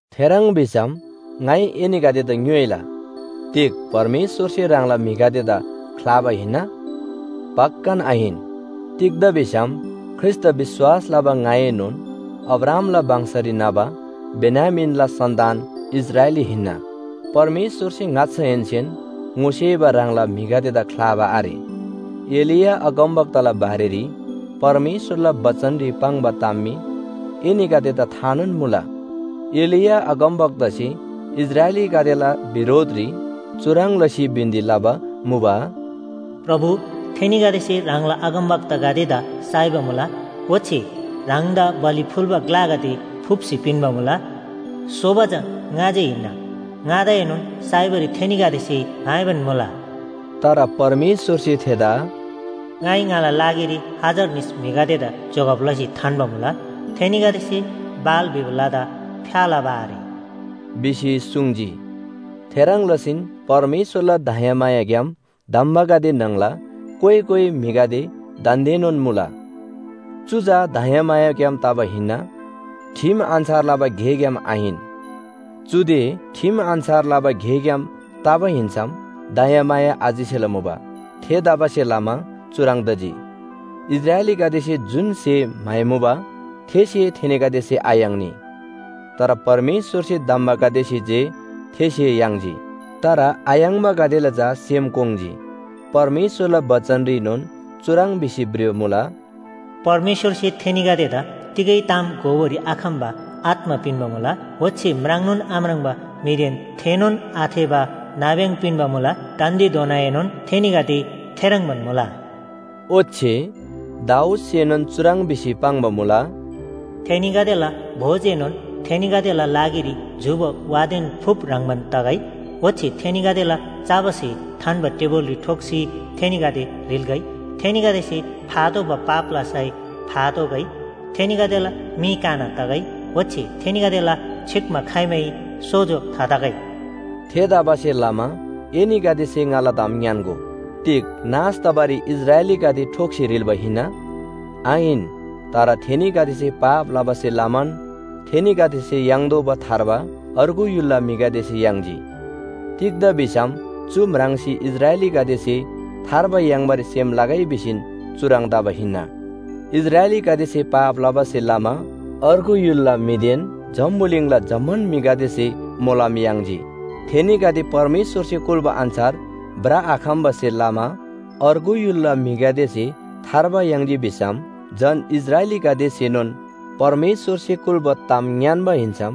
थेह्रङ् भिसम ङाइ एनीगदेदा ङ्‌योइला, “तिग परमेश्‍वरसे ह्राङला म्‍हिगदेदा ख्‍लाबा हिन्‍ना?” पक्‍कान आहिन! तिग्‍दा भिसम ख्रीष्‍टदा विश्‍वास लबा ङाएनोन अब्राहामला वंशरी न्‍हबा बेन्‍यामीनला सन्‍तान इस्राएली हिन्‍ना। परमेश्‍वरसे ङाच्‍छाहेन्‍सेन ङोसेबा ह्राङला म्‍हिगदेदा ख्‍लाबा आरे। एलिया अगमवक्ताला बारेरी परमेश्‍वरला बचनरी पाङ्बा ताम मी एनीगदेदा थानोन मुला। एलिया अगमवक्तासे इस्राएलीगदेला बिरोधरी परमेश्‍वरदेन छ्‌याम चुह्रङ् लसी बिन्‍ती लबा मुबा, “प्रभु, थेनीगदेसे ह्राङला अगमवक्तागदेदा साइबा मुला ओच्‍छे ह्राङदा बलि फुल्‍बा ग्‍लागदे फुप्‍सी पिन्‍बा मुला, सोबा चा ङा जे हिन्‍ना, ङादाएनोन साइबारी थेनीगदेसे म्‍हाइबान मुला।” तर परमेश्‍वरसे थेदा “ङाइ ङाला लागिरी हजार निस म्‍हिगदेदा जोगब लसी थान्‍बा मुला, थेनीगदेसे बाल भिबा लदा फ्‍या लबा आरे” भिसी सुङ्जी। थेह्रङ् लसीन परमेश्‍वरला दयामायाग्‍याम धम्‍बागदे न्‍हङला कोइ कोइ म्‍हिगदे दान्‍देनोन मुला। चु चा दयामायाग्‍याम तबा हिन्‍ना, ठिम अन्‍छार लबा गेग्‍याम आहिन। चुदे ठिम अन्‍छार लबा गेग्‍याम तबा हिन्‍सम दयामाया आचिसेला मुबा। थेतबासेलमा चुह्रङ् तजी, इस्राएलीगदेसे जुन स्‍हे म्‍हाइमुबा थे स्‍हे थेनीगदेसे आयाङ्नी। तर परमेश्‍वरसे धम्‍बागदेसे जे थे स्‍हे याङ्जी। तर आयाङ्बागदेला चा सेम कोङ्जी। परमेश्‍वरला बचनरीनोन चुह्रङ् भिसी भ्रिबा मुला, “परमेश्‍वरसे थेनीगदेदा तिगै ताम घोबारी आखम्‍बा आत्‍मा पिन्‍बा मुला, ओच्‍छे म्राङ्नोन आम्राङ्बा मीदेन थेःनोन आथेःबा नाब्‍यङ पिन्‍बा मुला, दान्‍देधोनाएनोन थेनीगदे थेह्रङ्बान मुला।” ओच्‍छे दाऊदसेनोन चुह्रङ् भिसी पाङ्बा मुला, “थेनीगदेला भोजएनोन थेनीगदेला लागिरी झूबा वादेन फुप ह्रङ्‌बान तगै। ओच्‍छे थेनीगदेला चबा स्‍हे थान्‍बा टेबुलरी ठोक्‍सी थेनीगदे ह्रिल्‍गै, थेनीगदेसे फातोःबा पापला सय फातोःगै। थेनीगदेला मी काना तगै, ओच्‍छे थेनीगदेला छिक्‍मा खाइमै सोजो थातगै।” थेतबासेलमा एनीगदेसे ङाला ताम ङ्‌यान्‍गो, “तिग नाश तबारीन इस्राएलीगदे ठोक्‍सी ह्रिल्‍बा हिन्‍ना?” आहिन। तर थेनीगदेसे पाप लबासे लमान थेनीगदेसे याङ्तोःबा थार्बा अर्गु य्‍हुलला म्‍हिगदेसे याङ्जी। तिग्‍दा भिसम चु म्राङ्सी इस्राएलीगदेसे थार्बा याङ्बारी सेम लगै भिसीन चुह्रङ् तबा हिन्‍ना। इस्राएलीगदेसे पाप लबासे लमा अर्गु य्‍हुलला म्‍हिदेन जम्‍बुलिङला जम्‍मान म्‍हिगदेसे मोलम याङ्जी। थेनीगदे परमेश्‍वरसे कुल्‍बा अन्‍छार भ्रआखम्‍बासे लमा अर्गु य्‍हुलला म्‍हिगदेसे थार्बा याङ्जी भिसम झन इस्राएलीगदेसेनोन परमेश्‍वरसे कुल्‍बा ताम ङ्‌यान्‍बा हिन्‍सम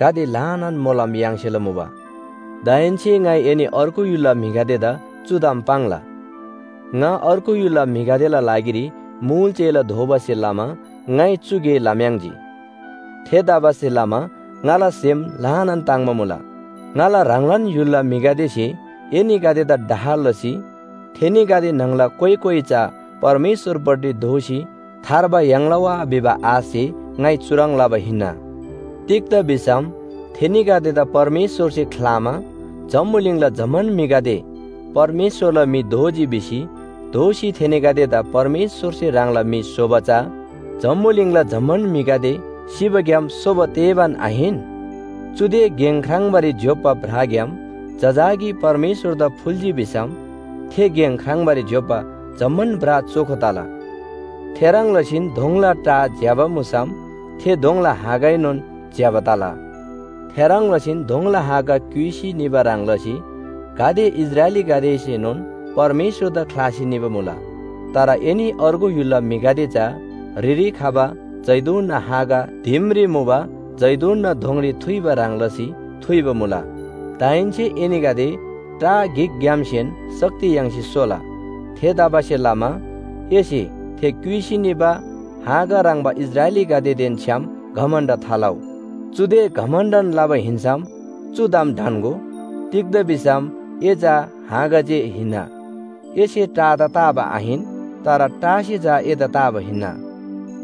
गाते ल्‍हानान मोलम याङ्सेला मुबा। दाहेन्‍से ङाइ एनी अर्गु य्‍हुलला म्‍हिगदेदा चु ताम पाङ्ला, ङा अर्गु य्‍हुलला म्‍हिगदेला लागिरी मुल चेला दोबासे लमा ङाइ चु गे लम्‍याङ्‌जी। थेतबासेलमा ङाला सेम ल्‍हानान ताङ्‍बा मुला। ङाला ह्राङलान य्‍हुलला म्‍हिगदेसे एनीगदेदा डाह लसी थेनीगदे न्‍हङला कोइ कोइ चा परमेश्‍वरपट्टि दोःसी थार्बा याङ्ला वा भिबा आशसे ङाइ चुह्रङ् लबा हिन्‍ना। तिग्‍दा भिसम थेनीगदेदा परमेश्‍वरसे ख्‍लामा जम्‍बुलिङला जम्‍मान म्‍हिगदे परमेश्‍वरला म्‍हि दोजी भिसी दोःसी थेनीगदेदा परमेश्‍वरसे ह्राङला म्‍हि स्‍होबा चा जम्‍बुलिङला जम्‍मान म्‍हिगदे सिबाग्‍याम सोबा तेबान आहिन? चुदे गेङ ख्राङ्बारी ज्‍योप्‍बा ब्राग्‍याम जजाकी परमेश्‍वरदा फुल्‍जी भिसम थे गेङ ख्राङ्बारी ज्‍योप्‍बा जम्‍मान ब्रा चोखो तला। थेह्रङ् लसीन दोङला टा ज्‍यबा मुसम थे दोङला हाँगाएनोन ज्‍यबा तला। थेह्रङ् लसीन दोङला हाँगा क्‍युइसी निबा ह्रङ् लसी गाते इस्राएलीगदेसेनोन परमेश्‍वरदा ख्‍लासी निबा मुला। तर एनी अर्गु य्‍हुलला म्‍हिगदे चा ह्रिरी खबा जैतूनना हाँगा दिमरी मुबा जैतूनना दोङरी थुइबा ह्रङ् लसी थुइबा मुला। दाहेन्‍से एनीगदे टा गिकग्‍यामसेन शक्ति याङ्सी सोला। थेतबासेलमा एसे थे क्‍युइसी निबा हाँगा ह्रङ्‌बा इस्राएलीगदेदेन छ्‌याम घमण्‍ड थालउ। चुदे घमण्‍डन लबा हिन्‍सम चु ताम ढन्‍गो, तिग्‍दा भिसम ए चा हाँगा जे हिन्‍ना, एसे टादा ताबा आहिन। तर टासे चा एदा ताबा हिन्‍ना।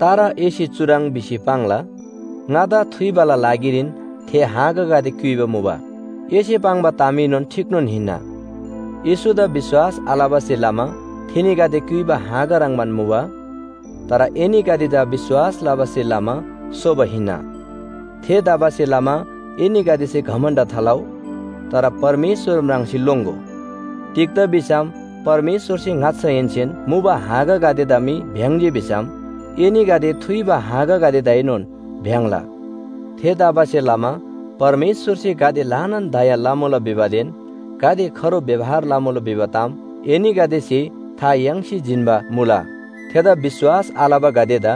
तर एसे चुह्रङ् भिसी पाङ्ला, “ङादा थुइबाला लागिरीन थे हाँगागदे क्‍युइबा मुबा।” एसे पाङ्बा तामएनोन ठीकनोन हिन्‍ना, येशूदा विश्‍वास आलबासे लमा थेनीगदे क्‍युइबा हाँगा ह्रङ्‌बान मुबा। तर एनीगदे चा विश्‍वास लबासे लमा सोबा हिन्‍ना। थेतबासेलमा एनीगदेसे घमण्‍ड थालउ, तर परमेश्‍वर म्राङ्सी लोङ्‍गो। तिग्‍दा भिसम परमेश्‍वरसे ङाच्‍छाहेन्‍सेन मुबा हाँगागदेदा मी भ्‍याङ्‍जी भिसम एनीगदे थुइबा हाँगागदेदाएनोन भ्‍याङ्‍ला। थेतबासेलमा परमेश्‍वरसे गाते ल्‍हानान दया लमुला भिबादेन गाते खरो व्‍यवहार लमुला भिबा ताम एनीगदेसे था याङ्सी जिन्‍बा मुला। थेदा विश्‍वास आलबागदेदा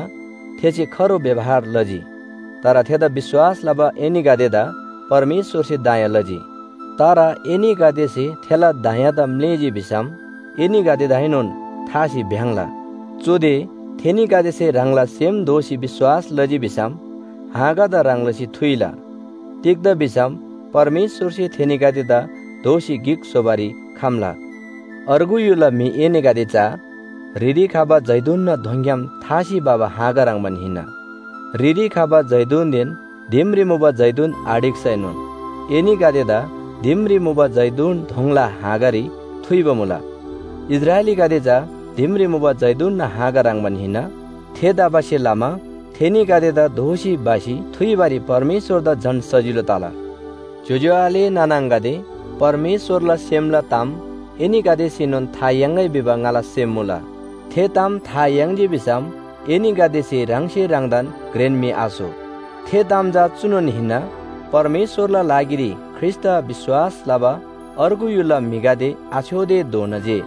थेसे खरो व्‍यवहार लजी। तर थेदा विश्‍वास लबा एनीगदेदा परमेश्‍वरसे दया लजी। तर एनीगदेसे थेला दयादा म्‍लेःजी भिसम एनीगदेदाएनोन थासी भ्‍याङ्‍ला। चुदे थेनीगदेसे ह्राङला सेम दोःसी विश्‍वास लजी भिसम हाँगादा ह्रङ् लसी थुइला। तिग्‍दा भिसम परमेश्‍वरसे थेनीगदेदा दोःसी गिक स्‍होबारी खम्‍ला। अर्गु य्‍हुलला म्‍हि एनीगदे चा ह्रिरी खबा जैतूनना दोङग्‍याम थासी भबा हाँगा ह्रङ्‌बान हिन्‍ना। ह्रिरी खबा जैतूनदेन दिमरी मुबा जैतून आढिक्‍सैनोन एनीगदेदा दिमरी मुबा जैतून दोङला हाँगारी थुइबा मुला। इस्राएलीगदे चा दिमरी मुबा जैतूनना हाँगा ह्रङ्‌बान हिन्‍ना। थेतबासेलमा थेनीगदेदा दोःसी भसी थुइबारी परमेश्‍वरदा झन सजिलो तला। ज्‍योज्‍यो आले नाना आङागदे, परमेश्‍वरला सेमला ताम एनीगदेसेनोन था याङ्‌गै भिबा ङाला सेम मुला। थे ताम था याङ्जी भिसम एनीगदेसे ह्राङसे ह्राङदान घ्रेन म्‍हि आस्‍हो। थे ताम चा चुनोन हिन्‍ना, परमेश्‍वरला लागिरी ख्रीष्‍टदा विश्‍वास लबा अर्गु य्‍हुलला म्‍हिगदे आछ्‌योतेधोना जे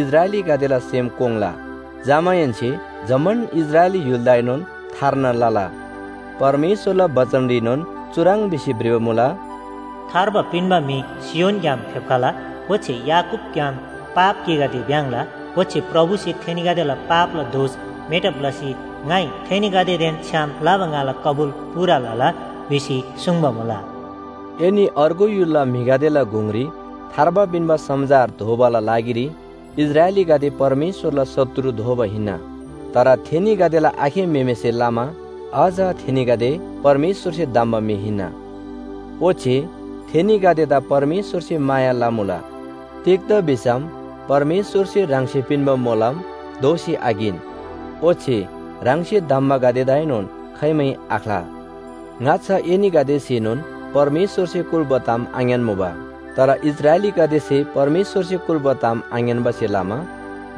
इस्राएलीगदेला सेम कोङ्ला। जमाहेन्‍से जम्‍मान इस्राएली य्‍हुलदाएनोन थार्ना लला। परमेश्‍वरला बचनरीनोन चुह्रङ् भिसी भ्रिबा मुला, “थार्बा पिन्‍बा म्‍हि सियोनग्‍याम फेप्‍खला, ओच्‍छे याकूबग्‍याम पाप गेगदे भ्‍याङ्‍ला।” “ओच्‍छे प्रभुसे ‘थेनीगदेला पापला दोष मेटब लसी ङाइ थेनीगदेदेन छ्‌याम लबा ङाला कबुल पूरा लला’ भिसी सुङ्बा मुला।” एनी अर्गु य्‍हुलला म्‍हिगदेला गुङरी थार्बा पिन्‍बा समाचार धोबाला लागिरी इस्राएलीगदे परमेश्‍वरला शत्रु दोबा हिन्‍ना। तर थेनीगदेला आखे म्‍हेमेसे लमा अझ थेनीगदे परमेश्‍वरसे धम्‍बा म्‍हि हिन्‍ना। ओच्‍छे थेनीगदेदा परमेश्‍वरसे माया लमुला। तिग्‍दा भिसम परमेश्‍वरसे ह्राङसे मोलम दोःसी आकिन, ओच्‍छे ह्राङसे धम्‍बागदेदाएनोन खाइमै आख्‍ला। ङाच्‍छा एनीगदेसेनोन परमेश्‍वरसे कुल्‍बा ताम आङ्‌यान्‍मुबा। तर इस्राएलीगदेसे परमेश्‍वरसे कुल्‍बा ताम आङ्‌यान्‍बासे लमा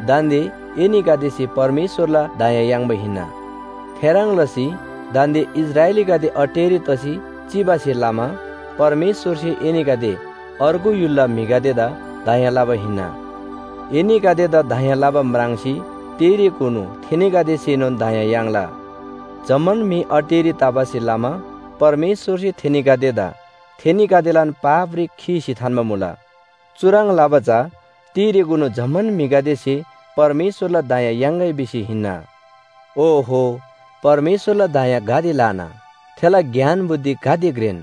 दान्‍दे एनीगदेसे परमेश्‍वरला दया याङ्बा हिन्‍ना। थेह्रङ् लसी दान्‍दे इस्राएलीगदे अटेरी तसी चिबासे लमा परमेश्‍वरसे एनीगदे अर्गु य्‍हुलला म्‍हिगदेदा दया लबा हिन्‍ना। एनीगदेदा दया लबा म्राङ्सी तिरेकुनु थेनीगदेसेनोन दया याङ्ला। जम्‍मान म्‍हि अटेरी तबासे लमा परमेश्‍वरसे थेनीगदेदा थेनीगदेलान पापरी खीसी थान्‍बा मुला। चुह्रङ् लबा चा तिरेकुनु जम्‍मान म्‍हिगदेसे परमेश्‍वरला दया याङ्‌गै भिसी हिन्‍ना। ओहो, परमेश्‍वरला दया गाते ल्‍हाना! थेला ज्ञान बुद्धि गाते घ्रेन!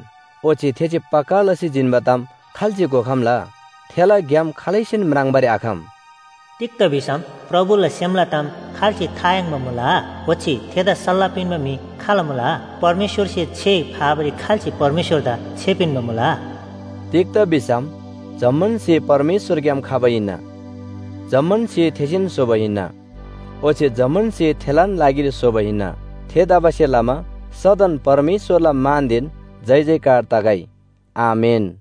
ओच्‍छे थेसे पक्‍का लसी जिन्‍बा ताम खाल्‍से घोखम्‍ला? थेला ग्‍याम खालैसेन म्राङ्बारी आखम! “तिग्‍दा भिसम प्रभुला सेमला ताम खाल्‍से था याङ्बा मुला? ओच्‍छे थेदा सल्‍लाह पिन्‍बा म्‍हि खाल मुला?” “परमेश्‍वरसे छे फाबारी खाल्‍से परमेश्‍वरदा छे पिन्‍बा मुला?” तिग्‍दा भिसम जम्‍मान स्‍हे परमेश्‍वरग्‍याम खबा हिन्‍ना। जम्‍मान स्‍हे थेसेन स्‍होबा हिन्‍ना। ओच्‍छे जम्‍मान स्‍हे थेलान लागिरी स्‍होबा हिन्‍ना। थेतबासेलमा सदन परमेश्‍वरला मानदेन जयजयकार तगै। आमेन।